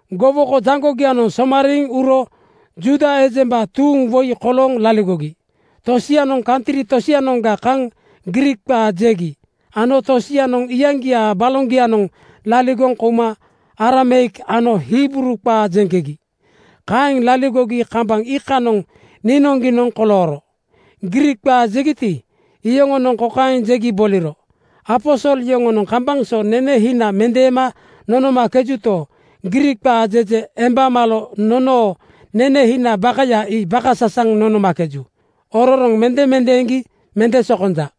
Gowoko jaŋgogianoŋ somariiŋ uro Juuda ejemba tuuŋ woi kolooŋ laligogi. Tosianoŋ kantri tosianoŋga kaŋ Griik qaa jegi ano tosianoŋ iyaŋgiaa baloŋgianoŋ laligoŋ kouma Arameik ano Hibruu qaa jeŋkegi. Kaeŋ laligogi kambaŋ iikanoŋ niinoŋgiinoŋ kolooro. Griik qaa jegiti, iyoŋonoŋ kokaeŋ jegi boliro, “Aposol yoŋonoŋ kambaŋ so nene hina mendeema nonomakejuto, Griik qaa jeje emba malo nonoo nene hina bakaya ii bakasasaŋ nonomakeju. Ororoŋ mende mendeeŋgi mende sokonja.”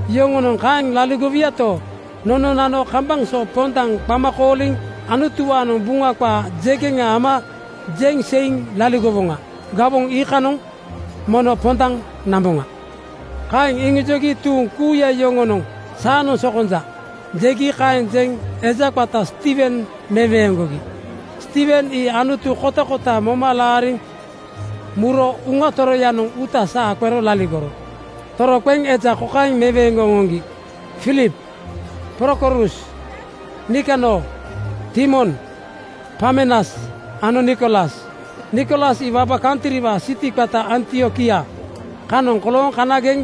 Yoŋonoŋ kaeŋ laligowuyato, nononano kambaŋ so pondaŋ qama kooliŋ Anutuwaanoŋ Buŋa qaa jegeŋa nama jeŋ seiŋ laligowoŋa. Gawoŋ iikanoŋ mono pondaŋ namboŋa.” Kaeŋ iŋijogi tuuŋ kuuya yoŋonoŋ “Saanoŋ sokonja,” jegi. Kaeŋ jeŋ eja qata Stiiwen meweeŋgogi. Stiiwen ii Anutu kotakota moma laariŋ muro Uŋa Toroyanoŋ uuta saa qero laligoro. Toroqeŋ eja kokaaŋ meweeŋgoŋ oŋoŋgi: Filip, Prokorus, Nikanor, Timon, Parmenas ano Nikolas. Nikolas ii waba kantriwaa siti qata Antiokia kanoŋ kolooŋ kanageŋ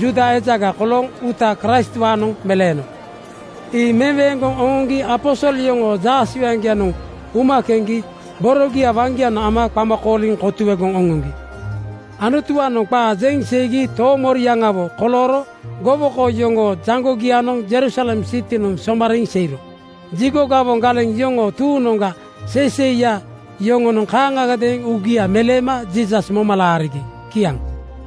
Juuda ejaga kolooŋ uuta Kraistwaanoŋ meleeno. Ii meweeŋgoŋ oŋoŋgi aposol yoŋoo jaasewaŋgianoŋ uma keŋgi borogia waŋgianoŋ ama qama kooliŋ kotuegoŋ oŋoŋgi. Anutuwaanoŋ qaa jeŋ seigi toomoriaŋawo kolooro gowoko yoŋoo jaŋgogianoŋ Jerusalem sitinoŋ somariiŋ seiro. Jigo gawoŋ galeŋ yoŋoo tuuŋnoŋga seiseiya yoŋonoŋ kaaŋagadeeŋ uugia meleema Jiisas moma laarigi. Kiaŋ.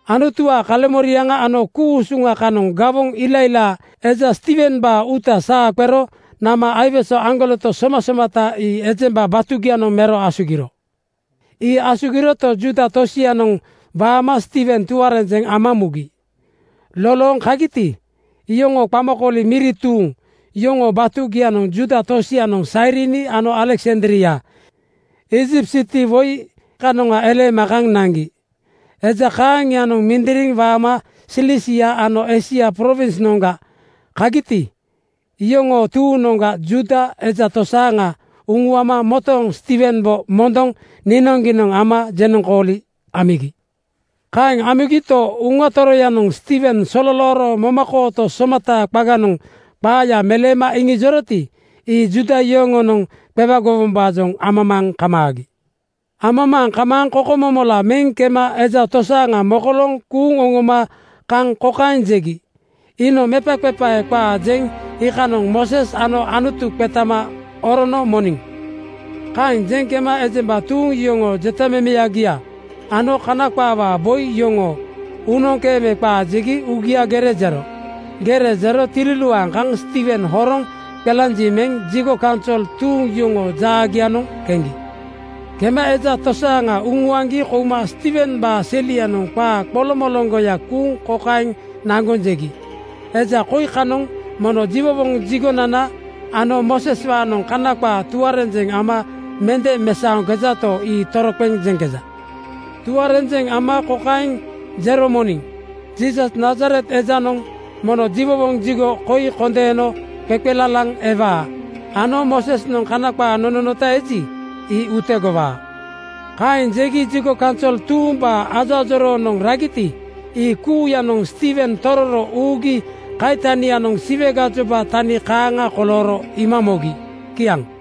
Anutuwaa kaleŋmoriaŋa ano ku-usuŋa kanoŋ gawoŋ ilailaa eja Stiiwembaa uuta saa qero nama aiwese aŋgoleto somasomata ii ejemba batugianoŋ mero asugiro. Ii asugiroto, Juuda tosianoŋ waama Stiiwen tuarenjeŋ ama mugi. “Lolooŋ kagiti, iyoŋoo qamakooli miri tuuŋ” yoŋoo batugianoŋ Juuda tosianoŋ Sairini ano Aleksandria Iijipt siti woi kanoŋa eleema kaŋ naŋgi. Eja kaaŋianoŋ mindiriŋ waama Silisia ano Eisia prowinsnoŋga kagiti, iyoŋoo tuuŋnoŋga Juuda eja tosaaŋa uŋuama motooŋ Stiiwembo mondoŋ niinoŋgiinoŋ ama jenoŋkooli amigi. Kaeŋ amigito, Uŋa Toroyanoŋ Stiiwen sololooro momakooto somataa qaganoŋ qaaya meleema iŋijoroti, ii Juuda yoŋonoŋ qewagowombaajoŋ amamaaŋ kamaagi. Amamaaŋ kamaaŋ kokomomola meŋ kema eja tosaaŋa mokolooŋ kuuŋ oŋoma kaŋ kokaeŋ jegi, “Iinoŋ mepaqepae qaa jeŋ iikanoŋ Mooses ano Anutu qetama orono moniŋ.” Kaeŋ jeŋ kema ejemba tuuŋ, iyoŋoo jotamemeyagia ano Kana qaawaa boi yoŋoo uunoŋkeeme qaa jegi uugia gere jero. Gere jero tililuaaŋ kaŋ Stiiwen horoŋ qelanjiŋ meŋ jigo kaunsol tuuŋ yoŋoo jaagianoŋ keŋgi. Kema eja tosaaŋa uŋuaŋgi kouma Stiiwembaa selianoŋ qaa qoloŋmoloŋgoya kuuŋ kokaeŋ naŋgoŋ jegi, “Eja koi kanoŋ mono jiwowoŋ jigonana ano Mooseswaanoŋ Kana qaa tuarenjeŋ ama mende mesaoŋkejato, ii toroqeŋ jeŋkeja. Tuarenjeŋ ama kokaeŋ jero moniŋ, ‘Jiisas, Nazaret ejanoŋ mono jiwowoŋ jigo koi kondeeno qeqelalaŋ ewaa ano Moosesnoŋ Kana qaa nononota eji, ii utegowaa.’” Kaeŋ jegi jigo kaunsol tuumbaa ajoajoroonoŋ ragiti, ii kuuyanoŋ Stiiwen tororo uugi kaitanianoŋ Siwe gajoba tani kaaŋa kolooro iima mogi. Kiaŋ.